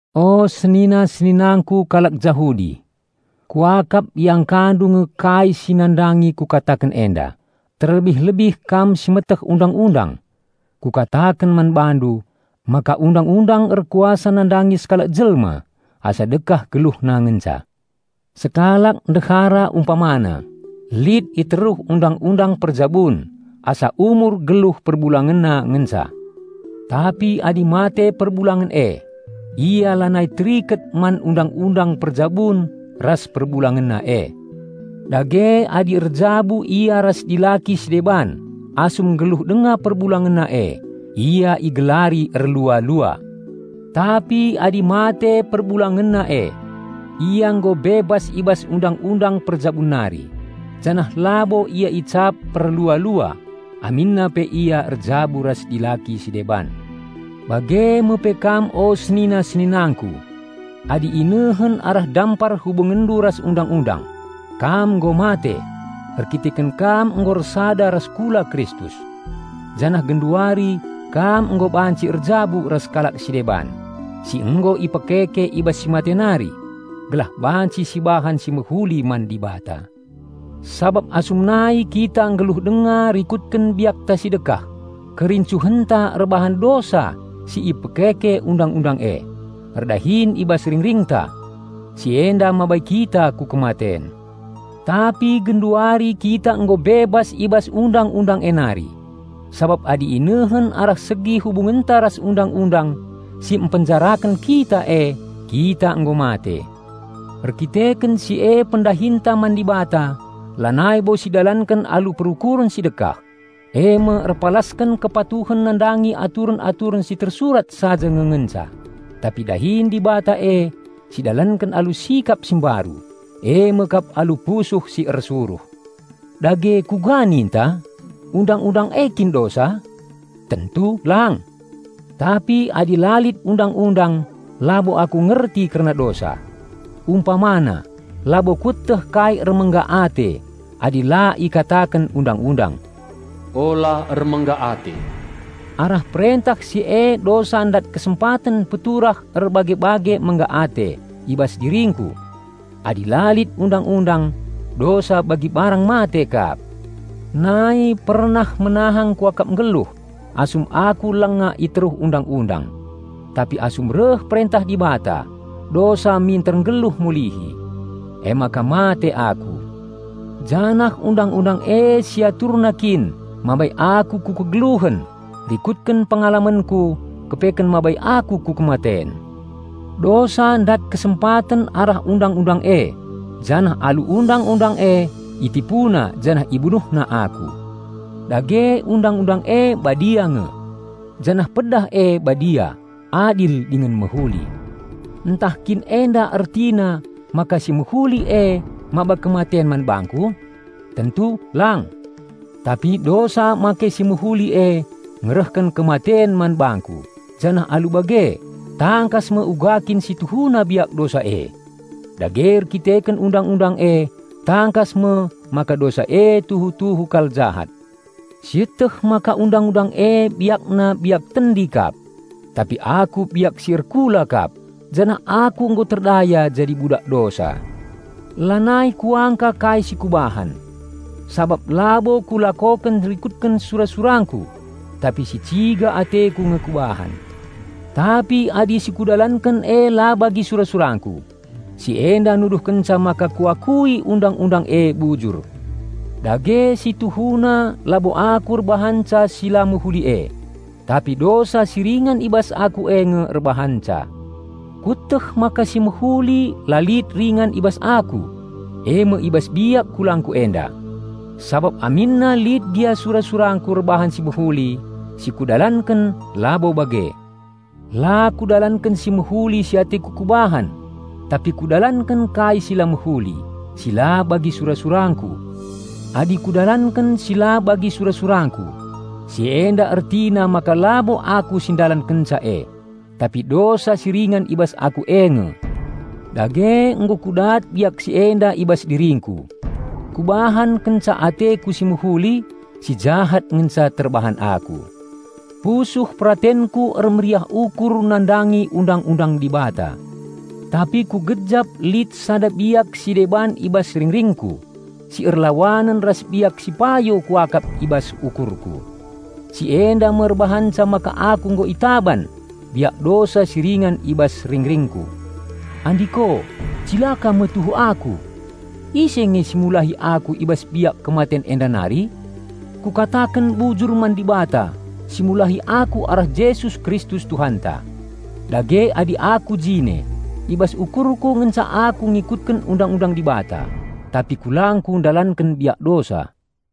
O senina-seninangku kalak Jahudi, kuakap iangkandu nge kai si nandangi kukataken enda, terlebih-lebih kam si meteh Undang-undang. Kukataken man bandu, maka undang-undang erkuasa nandangi sekalak jelma asa dekah geluhna ngenca. Sekalak ndehara umpamana, lit i teruh undang-undang perjabun asa umur geluh perbulangenna ngenca. Tapi adi mate perbulangenna e, ia lanai teriket man undang-undang perjabun ras perbulangenna e. Dage adi erjabu ia ras dilaki si deban asum nggeluh denga perbulangenna e, ia igelari erlua-lua. Tapi adi mate perbulangenna e, ia nggo bebas i bas undang-undang perjabun nari, janah labo ia icap perlua-lua aminna pe ia erjabu ras dilaki si deban. Bage me pe kam o senina-seninangku, adi inehen arah dampar hubungenndu ras undang-undang, kam nggo mate, erkiteken kam nggo ersada ras kula Kristus. Janah genduari kam nggo banci "erjabu" ras kalak si deban, si nggo ipekeke i bas si mate nari, gelah banci sibahan si mehuli man Dibata. Sabap asum nai kita nggeluh denga rikutken biakta si dekah, kerincuhenta erbahan dosa si ipekeke undang-undang e, erdahin i bas ringringta. Si enda mabai kita ku kematen. Tapi genduari kita nggo bebas i bas Undang-undang e nari, sabap adi inehen arah segi hubungenta ras Undang-undang si mpenjaraken kita e kita nggo mate. Erkiteken si e pendahinta man Dibata lanai bo sidalanken alu perukuren si dekah, eme erpalasken kepatuhen nandangi aturen-aturen si tersurat saja nge ngenca, tapi dahin Dibata e si dalanken alu sikap si mbaru, eme kap alu pusuh si ersuruh. Dage kuga ninta? Undang-undang e kin dosa? Tentu lang! Tapi adi la lit Undang-undang labo aku ngerti kerna dosa. Umpamana, labo kueteh kai ermengga ate adi la ikataken Undang-undang, "Ula ermengga ate!" Arah perentah si e dosa ndat kesempaten peturah erbage-bage mengga ate i bas diringku. Adi la lit Undang-undang, dosa bagi barang mate kap. Nai pernah menahang kuakap nggeluh asum aku langa i teruh Undang-undang; tapi asum reh perentah Dibata, dosa minter nggeluh mulihi. Emaka mate aku. Janah Undang-undang e si aturna kin mabai aku ku kegeluhen, rikutken pengalamenku kepeken mabai aku ku kematen. Dosa ndat kesempaten arah Undang-undang e janah alu Undang-undang e itipuna janah ibunuhna aku. Dage Undang-undang e badia nge. Janah pedah e badia, adil dingen mehuli. Ntah kin enda ertina maka si mehuli e maba kematen man bangku? Tentu lang! Tapi dosa make si mehuli e ngerehken kematen man bangku, janah alu bage, tangkas me uga kin si tuhuna biak dosa e. Dage erdandanken Undang-undang e tangkas me maka dosa e tuhu-tuhu kal jahat. Sieteh maka Undang-undang e biakna biak tendi kap; tapi aku biak si erkula kap, janah aku nggo terdaya jadi budak dosa. Lanai kuangka kai si kubahan; sabap labo kulakoken rikutken sura-surangku, tapi si ciga ateku nge kubahan. Tapi adi si kudalanken e la bagi sura-surangku, si enda nuduhkenca maka kuakui Undang-undang e bujur. Dage si tuhuna labo aku erbahanca si la mehuli e; tapi dosa si ringan i bas aku e nge erbahanca. Kueteh maka si mehuli la lit ringan i bas aku, eme i bas biak kulangku enda. Sabap aminna lit gia sura-surangku erbahan si mehuli, si kudalanken labo bage. La kudalanken si mehuli si ateku kubahan, tapi kudalanken kai si la mehuli, si la bagi sura-surangku. Adi kudalanken si la bagi sura-surangku, si enda ertina maka labo aku si ndalankenca e, tapi dosa si ringan i bas aku e nge. Dage nggo kudat biak si enda i bas diringku: Kubahan kenca ateku si mehuli, si jahat ngenca terbahan aku. Pusuh peratenku ermeriah ukur nandangi Undang-undang Dibata, tapi kugejap lit sada biak si deban i bas ringringku si erlawanen ras biak si payo kuakap i bas ukurku. Si enda me erbahanca maka aku nggo itaban biak dosa si ringan i bas ringringku. Andiko, cilaka me tuhu aku! Ise nge si mulahi aku i bas biak kematen enda nari? Kukataken bujur man Dibata si mulahi aku arah Jesus Kristus Tuhanta. Dage adi aku jine, i bas ukurku ngenca aku ngikutken Undang-undang Dibata, tapi kulangku ndalanken biak dosa.